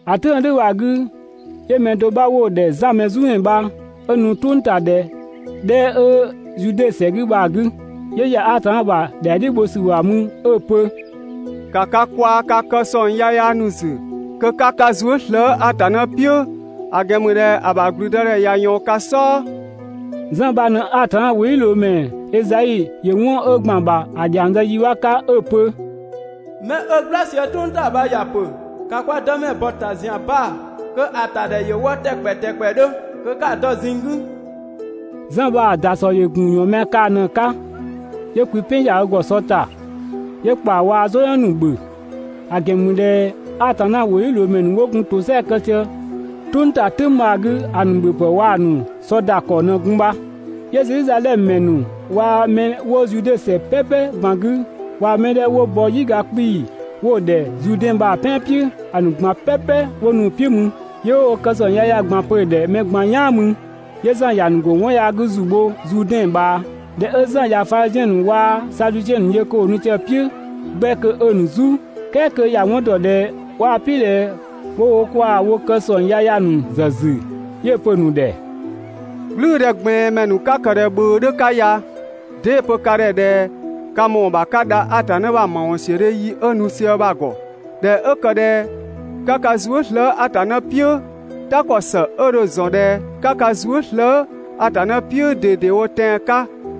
‑A "tʋ̈ng 'ö "dhʋ̈ bha‑ 'gü, 'yö mɛ do 'bha 'wo‑ ‑dhɛ Zan Mɛzumɛ bha 'ö nu "tʋngtadhɛ 'dhɛ 'ö Zude ‑sɛ 'gü bha‑ 'gü, 'yö ‑ya Atanna ‑bha ‑dhɛa "dhiʋ̈ bho ‑sü ‑bha mü 'ö‑ pö: «‑Ka ka kwaa‑ ka kë ‑sɔng yaya ‑nu ‑zü kö 'ka ka zuë" slëë‑ Atanna "piʋ̈, ‑a ‑gɛn ‑mü ꞊dhɛ ‑a ‑bha ‑gblüdëdhɛ ꞊ya ꞊yɔɔn ka "sɔɔ!» Zan bha ꞊në Atanna ‑wʋdhiʋ̈loomɛ Ezai ‑yö 'wɔn 'ö ‑gban ‑bha ‑a ‑dhiang zë yi 'bha 'ka 'ö‑ pö: «'Mɛ 'ö "gbla sië "tʋng ‑ta bha ‑ya pö: ‑Ka kwa Dëmɛ ‑bɔ ‑ta ‑zian baa‑ kö ‑a ‑ta ‑dhɛ ‑yö wɔ ‑tɛkpɛ ‑tɛkpɛdhö, kö 'ka‑ dɔ ꞊zinng 'gü!» Zan bha‑ ‑dasɔ ‑yö ‑gun ‑yɔɔnmɛa kaa‑ ꞊në‑ 'ka, 'yö kwi "pɛn ‑ya ö ‑gɔ sɔ ‑ta, 'yö ‑kpaa waa‑ "zɔyɔn ‑nu ‑bhö. (‑A ‑gɛn ‑mü ꞊dhɛ Atanna ‑wʋdhiʋ̈loomɛ ‑nu 'wo gun ‑tosɛa kë sië "tʋng ‑ta "tʋ̈ng bha‑ 'gü ‑a ‑nu ‑bhöpë waa‑ ‑nu sɔ ‑da ‑kɔ ꞊në gun bha.) 'Yö Zedhizadhɛmö ‑mɛ ‑nu waa‑ 'mɛ 'wo Zude ‑sɛ "pɛpɛ ꞊gban 'gü waa‑ mɛ 'dhɛ 'wo bɔ "yiga 'kpii‑ 'wo‑ ‑dhɛ Zuudɛn bha‑ "pɛan "piʋ̈, ‑a ‑nu ꞊gban "pɛpɛ 'wo nu‑ "piʋ̈ mü. 'Yö 'wo wo kë ‑sɔng yaya ꞊gban pö‑ ‑dhɛ mɛ ꞊gban "yaan mü, 'yö Zan ‑ya ‑nu ‑go 'wɔn yaa 'gü ‑zu bho Zuudɛn ꞊bhaa. ꞊Dhɛ 'ö Zan ꞊ya Fadhiziɛn ‑nu waa‑ Sadusiɛn ‑nu yö kö ‑wo nu sië ö "piʋ̈ 'gbɛ kö 'ö‑ ‑nu "zu, ("kɛɛ kö ‑ya 'wɔn dɔ ꞊dhɛ 'waa‑ "piʋ̈ ꞊dhɛ 'wo wo kwaa‑ wo kë ‑sɔng yaya ‑nu ‑zë ‑zü) 'yö‑ pö‑ ‑nu ‑dhɛ: «"Gblʋ̈ʋ̈dhɛgblɛɛnmɛ ‑nu 'ö 'ka ꞊dhɛ ꞊bhʋ̈ʋ̈ 'dhö ya, 'dee‑ pö ka ‑dhɛ ꞊dhɛ ka ‑mɔɔ ‑bha 'ka dha Atanna ‑bha ‑mawɔnsiödhe yi 'ö nu sië bha‑ ‑gɔ?» ꞊Dhɛ 'ö ‑kë ꞊dhɛ 'ka ka zuë" slëë‑ Atanna "piʋ̈, "ta ‑kɔ ‑së 'ö dho‑ ‑zɔn ꞊dhɛ 'ka ka zuë" slëë‑ Atanna "piʋ̈ ꞊dedewo tɛan‑ 'ka,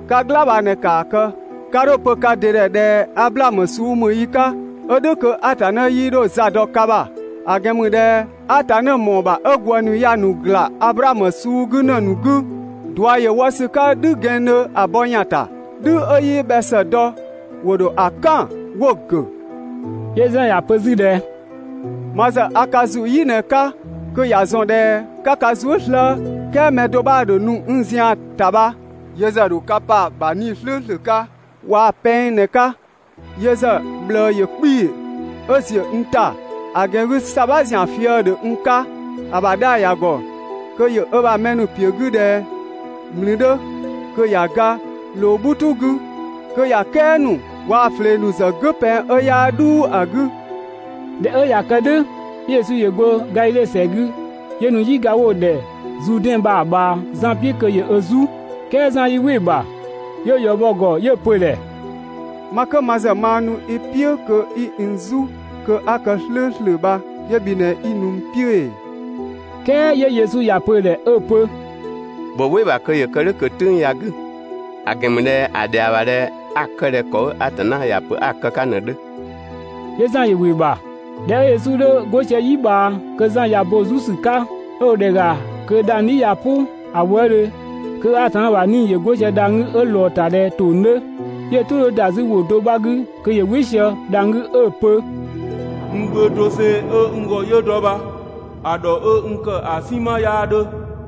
'ka "gla bha ꞊në, ‑kaa kë! 'Ka 'dho‑ pö ka ‑dɩ ‑dhɛ ꞊dhɛ: «Ablaamö suu ‑mü yi 'ka, (ö "dhʋ̈ kö Atanna 'yii 'dho za dɔ ka ‑bha)», ‑a ‑gɛn ‑mü ꞊dhɛ Atanna ‑mɔɔ ‑bha 'ö ‑gwë ‑nu ya‑ ‑nu ‑gla Ablaamö suu 'gü ‑në ‑nu 'gü! ꞊Dua ‑yö wɔ ‑sü 'ka "dhü gɛnngdhö ‑a bɔ ‑yan ‑ta. "Dhü 'ö 'yii bhɛ ‑së dɔ, ‑wo ‑dho ‑a "kan 'wo‑ ‑gʋ̈.» 'Yö Zan ‑ya pö 'zü ꞊dhɛ: «Ma ‑zë ‑a ka ‑zu "yi ꞊në‑ 'ka, kö ‑ya ‑zɔn ꞊dhɛ 'ka ka zuë" slëë‑, "kɛɛ mɛ do 'bha ‑dho nu n zian‑ ‑ta bha, yö ‑zë ‑yö ‑dho ka pa‑ ‑bha 'Nii‑ "slʋ̈ʋ̈slʋ̈ waa‑ pɛng ꞊në‑ 'ka. Yö ‑zë ꞊bhlëë ‑yö 'kpii‑ 'ö ‑ziö n ‑ta, ‑a ‑gɛn 'gü ‑sabha ‑zian fië‑ ‑dhö n 'ka. ‑A ‑bha 'dhaa‑ ‑ya ‑gɔ kö ‑yö ö ‑bha mɛ ‑nu ‑piö 'gü ꞊dhɛ ‑mlü 'dhö, kö ‑ya ga ꞊loo "bhutu 'gü, kö ‑ya "kɛa ‑nu waa‑ ꞊flee ‑nu ‑zë "gʋ̈ pɛng 'ö 'yaa "dhuu ‑a 'gü. ꞊Dhɛ 'ö ꞊ya kë "dhʋ̈, 'yö Yesu ‑yö go Gadhidhe ‑sɛ 'gü, 'yö nu "yiga 'wo‑ ‑dhɛ Zuudɛn bha‑ ꞊bhaa Zan "piʋ̈ kö ‑yö ö "zu. "Kɛɛ Zan yii‑ "wɩ‑ ‑bha, 'yö‑ ‑yɔ bɔ‑ ‑gɔ 'yö‑ pö‑ ‑dhɛ: «Ma 'kö ma ‑zë maa nu i "piʋ̈ kö 'i n "zu kö 'a kë "slʋ̈ʋ̈slʋ̈ bha 'yö bhi ꞊në 'i nu n "piʋ̈ ‑ee? "Kɛɛ 'yö Yesu ‑ya pö‑ ‑dhɛ 'ö‑ pö: «‑Bhö "wɩ‑ ‑bha kö ‑yö kë "dhʋ̈ ꞊kö "tʋ̈ng ya‑ 'gü, ‑a ‑gɛn ‑mü ꞊dhɛ ‑a ‑dhɛa ‑bha ‑dhɛ 'a‑ kë ꞊dhɛ ‑kɔ 'ö Atanna ‑ya pö‑ 'ka ꞊në‑ 'dhö.» 'Yö Zan ‑yö ‑wɩ ‑bha. ꞊Dhɛ 'ö Yesu 'dhö 'go sië "yi ꞊bhaa (kö Zan ꞊ya bo‑ "zu ‑sü 'ka), 'ö dho ‑dhɛ ‑ga kö dhang‑ "dhi ꞊ya "pʋ ‑a wëëdhö kö Atanna ‑bha 'Nii‑ ‑yö 'go sië dhang‑ 'gü 'ö ꞊lɔɔ‑ ‑ta ꞊dhɛ ‑tong 'dhö, 'yö‑ "tʋ 'dhö ‑da 'zü ‑wʋ do 'bha 'gü kö ‑yö "wɩ sië dhang‑ 'gü 'ö‑ pö: «N Gbö doseng 'ö n ‑gɔ 'yö dɔ bha‑ ‑dhɔ 'ö n kë ‑a "sinma 'yaa 'dhö.»